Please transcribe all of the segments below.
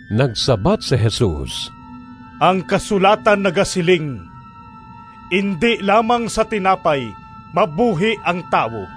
Nagsabat si Jesus, “Ang kasulatan nagasiling, ‘Indi lamang sa tinapay mabuhi ang tawo.’”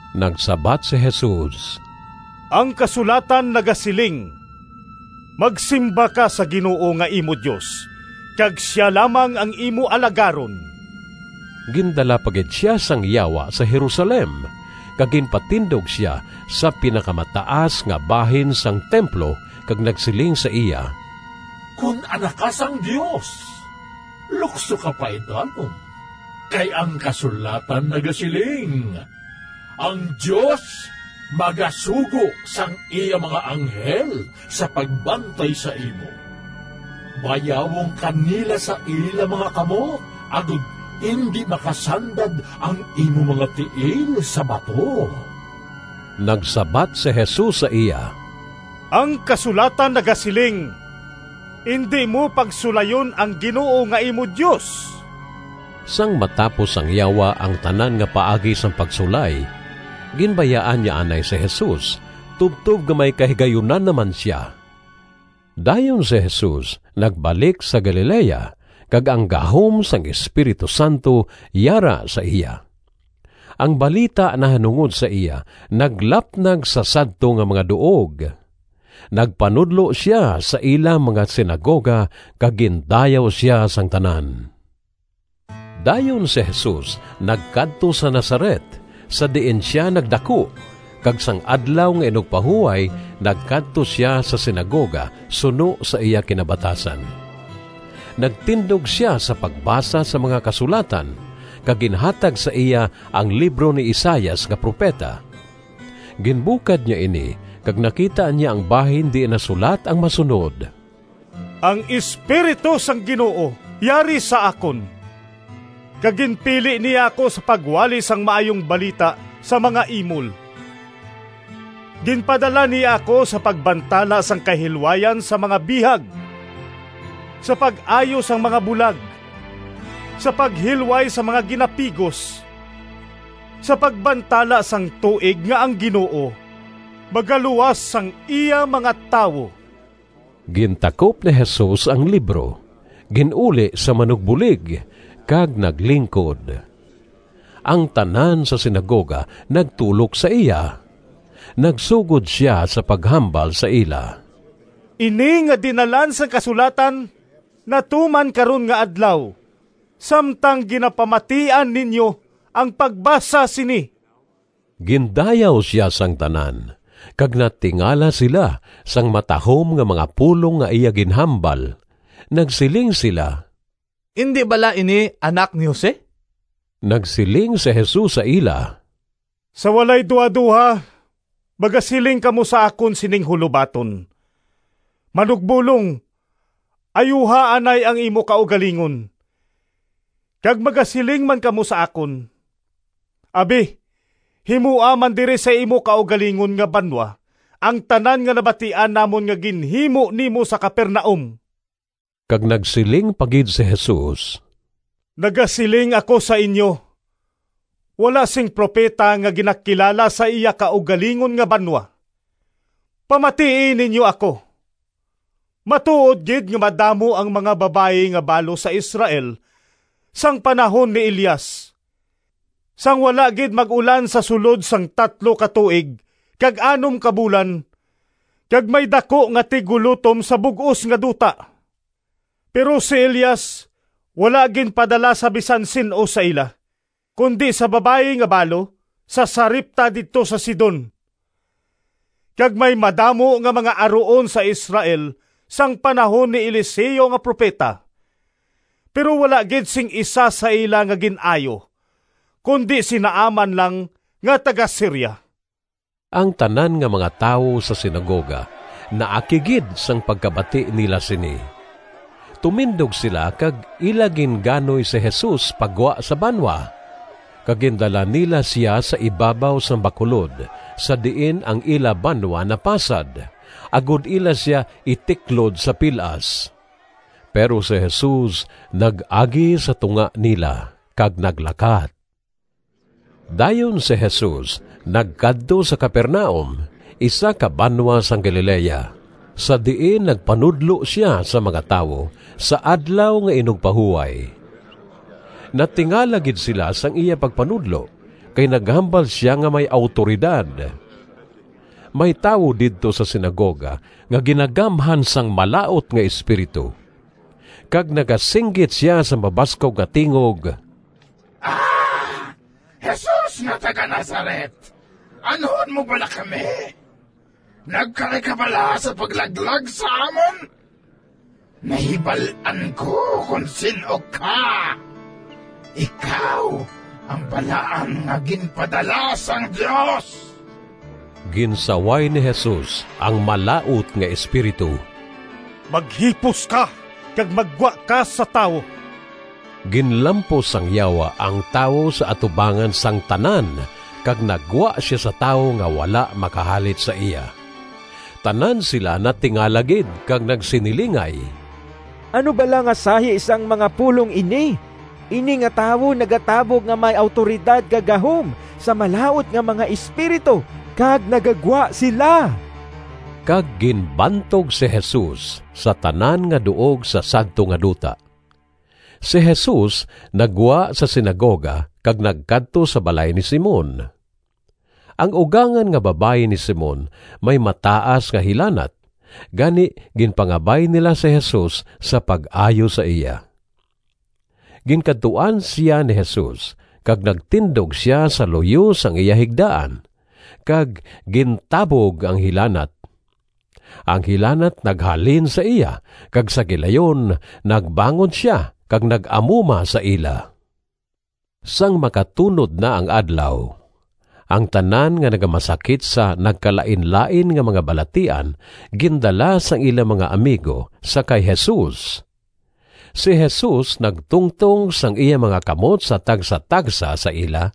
Nagsabat si Jesus, “Ang kasulatan nagasiling, ‘Magsimba ka sa Ginoo nga imo Dios kag sia lamang ang imo alagaron.’” Gindala pa gid sia sang Yawa sa Jerusalem, kag ginpatindog sia sa pinakamataas nga bahin sang templo kag nagsiling sa iya, “Kon Anak ka sang Dios, lukso ka paidalom. Kay ang kasulatan nagasiling, ‘Ang Dios magasugo sang iya mga anghel sa pagbantay sa imo. Bayawon ka nila sa ila mga kamot agod indi makasandad ang imo mga tiil sa bato.’” Nagsabat si Jesus sa iya, “Ang kasulatan nagasiling, ‘Indi mo pagsulayon ang Ginoo nga imo Dios.’” Sang matapos sang Yawa ang tanan nga paagi sang pagsulay, ginbayaan niya anay si Jesus tubtob nga may kahigayunan na man sia. Dayon si Jesus nagbalik sa Galilea, kag ang gahom sang Espiritu Santo yara sa iya. Ang balita nahanungod sa iya naglapnag sa sadto nga mga duog. Nagpanudlo sia sa ila mga sinagoga kag gindayaw sia sang tanan. Dayon si Jesus nagkadto sa Nazaret, sa diin sia nagdaku, kag sang Adlaw nga Inugpahuway nagkadto sia sa sinagoga suno sa iya kinabatasan. Nagtindog sia sa pagbasa sang mga Kasulatan, kag ginhatag sa iya ang libro ni Isaias nga propeta. Ginbukad niya ini kag nakita niya ang bahin diin nasulat ang masunod: “Ang Espiritu sang Ginoo yari sa akon. Kag ginpili niya ako sa pagwali Sang Maayong Balita sa mga imol, Ginpadala niya ako sa pagbantala Sang kahilwayan sa mga bihag, Sa pag-ayo sang mga bulag, Sa paghilway sang mga ginapigos, Sa pagbantala sang tuig nga ang Ginoo Magaluwas sang iya mga tawo.” Gintakop ni Jesus ang libro, gin-uli sa manugbulig, kag naglingkod. Ang tanan sa sinagoga nagtulok sa iya. Nagsugod sia sa paghambal sa ila, “Ini nga dinalan sang kasulatan natuman karon nga adlaw samtang ginapamatian ninyo ang pagbasa sini.” Gindayaw sia sang tanan, kag natingala sila sang matahom nga mga pulong nga iya ginhambal. Nagsiling sila, “Indi bala ini anak ni Jose?” Nagsiling si Jesus sa ila, “Sa walay duhadoha magasiling kamo sa akon sining hulobaton, ‘Manugbolong, ayuha anay ang imo kaugalingon.’ Kag magasiling man kamo sa akon, ‘Abi, himoa man diri sa imo kaugalingon nga banwa ang tanan nga nabatian namon nga ginhimo nimo sa Capernaum.’” Kag nagsiling pa gid si Jesus, “Nagasiling ako sa inyo: wala sing propeta nga ginakilala sa iya kaugalingon nga banwa! Pamatii ninyo ako: matuod gid nga madamo ang mga babayi nga balo sa Israel sang panahon ni Elias, sang wala gid mag-ulan sa sulod sang tatlo ka tuig kag anom ka bulan kag may daku nga tiggulotom sa bug-os nga duta, pero si Elias wala ginpadala sa bisan sin-o sa ila, kundi sa babayi nga balo sa Sarepta didto sa Sidon. Kag may madamo nga mga aruon sa Israel sang panahon ni Eliseo nga propeta, pero wala gid sing isa sa ila nga gin-ayo, kundi si Naaman lang nga taga-Siria.” Ang tanan nga mga tawo sa sinagoga naakig gid sang pagkabati nila sini. Tumindog sila kag ila ginganoy si Jesus pa gwa sa banwa, kag gindala nila sia sa ibabaw sang bakulod sa diin ang ila banwa napasad, agod ila sia itiklod sa pil-as. Pero si Jesus nag-agi sa tunga nila, kag naglakat. Dayon si Jesus nagkadto sa Capernaum, isa ka banwa sang Galilea, sa diin nagpanudlo sia sa mga tawo sa Adlaw nga Inugpahuway. Natingala gid sila sang iya pagpanudlo, kay naghambal sia nga may awtoridad. May tawo didto sa sinagoga nga ginagamhan sang malaut nga espiritu, kag nagasinggit sia sa mabaskog nga tingog, “A! Jesus nga taga-Nazaret, anhon mo bala kami? Nagkari ka bala sa paglaglag sa amon? Nahibal-an ko kon sin-o ka. Ikaw ang Balaan nga ginpadala sang Dios!” Ginsaway ni Jesus ang malaut nga espiritu, “Maghipos ka, kag maggwa ka sa tawo!” Ginlampos sang yawa ang tawo sa atubangan sang tanan kag naggwa sia sa tawo nga wala makahalit sa iya. Tanan sila natingala gid kag nagsinilingay, “Ano bala nga sahi sang mga pulong ini? Ini nga tawo nagatabog nga may awtoridad kag gahom sa malaut nga mga espiritu kag nagagwa sila!” Kag ginbantog si Jesus sa tanan nga duog sa sadto nga duta. Si Jesus naggwa sa sinagoga kag nagkadto sa balay ni Simon. Ang ugangan nga babayi ni Simon may mataas nga hilanat, gani ginpangabay nila si Jesus sa pag-ayo sa iya. Ginkadtuan sia ni Jesus kag nagtindog sia sa luyo sang iya higdaan, kag gintabog ang hilanat. Ang hilanat naghalin sa iya kag sa gilayon nagbangon sia kag nag-amuma sa ila. Sang makatunod na ang adlaw, ang tanan nga nagamasakit sa nagkalainlain nga mga balatian gindala sang ila mga amigo sa kay Jesus. Si Jesus nagtungtong sang iya mga kamot sa tagsatagsa sa ila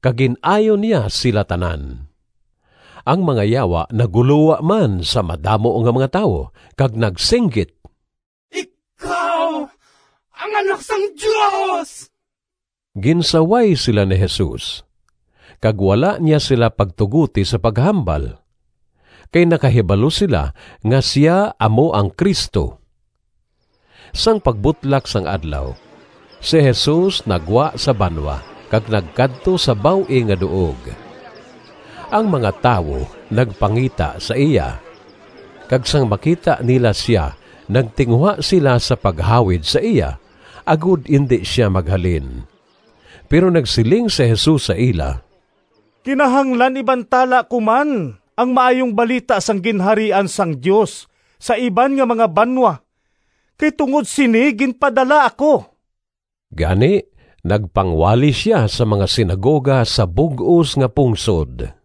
kag gin-ayo niya sila tanan. Ang mga yawa naggulowa man sa madamo nga mga tawo, kag nagsinggit, “Ikaw ang Anak sang Dios.” Ginsaway sila ni Jesus, kag wala niya sila pagtugoti sa paghambal, kay nakahibalo sila nga sia amo ang Cristo. Sang pagbutlak sang adlaw, si Jesus naggwa sa banwa kag nagkadto sa baw-ing nga duog. Ang mga tawo nagpangita sa iya, kag sang makita nila sia nagtinguha sila sa paghawid sa iya, agod indi sia maghalin. Pero nagsiling si Jesus sa ila, “Kinahanglan ibantala ko man ang Maayong Balita sang Ginharian sang Dios sa iban nga mga banwa, kay tungod sini ginpadala ako.” Gani nagpangwali sia sa mga sinagoga sa bug-os nga pungsod.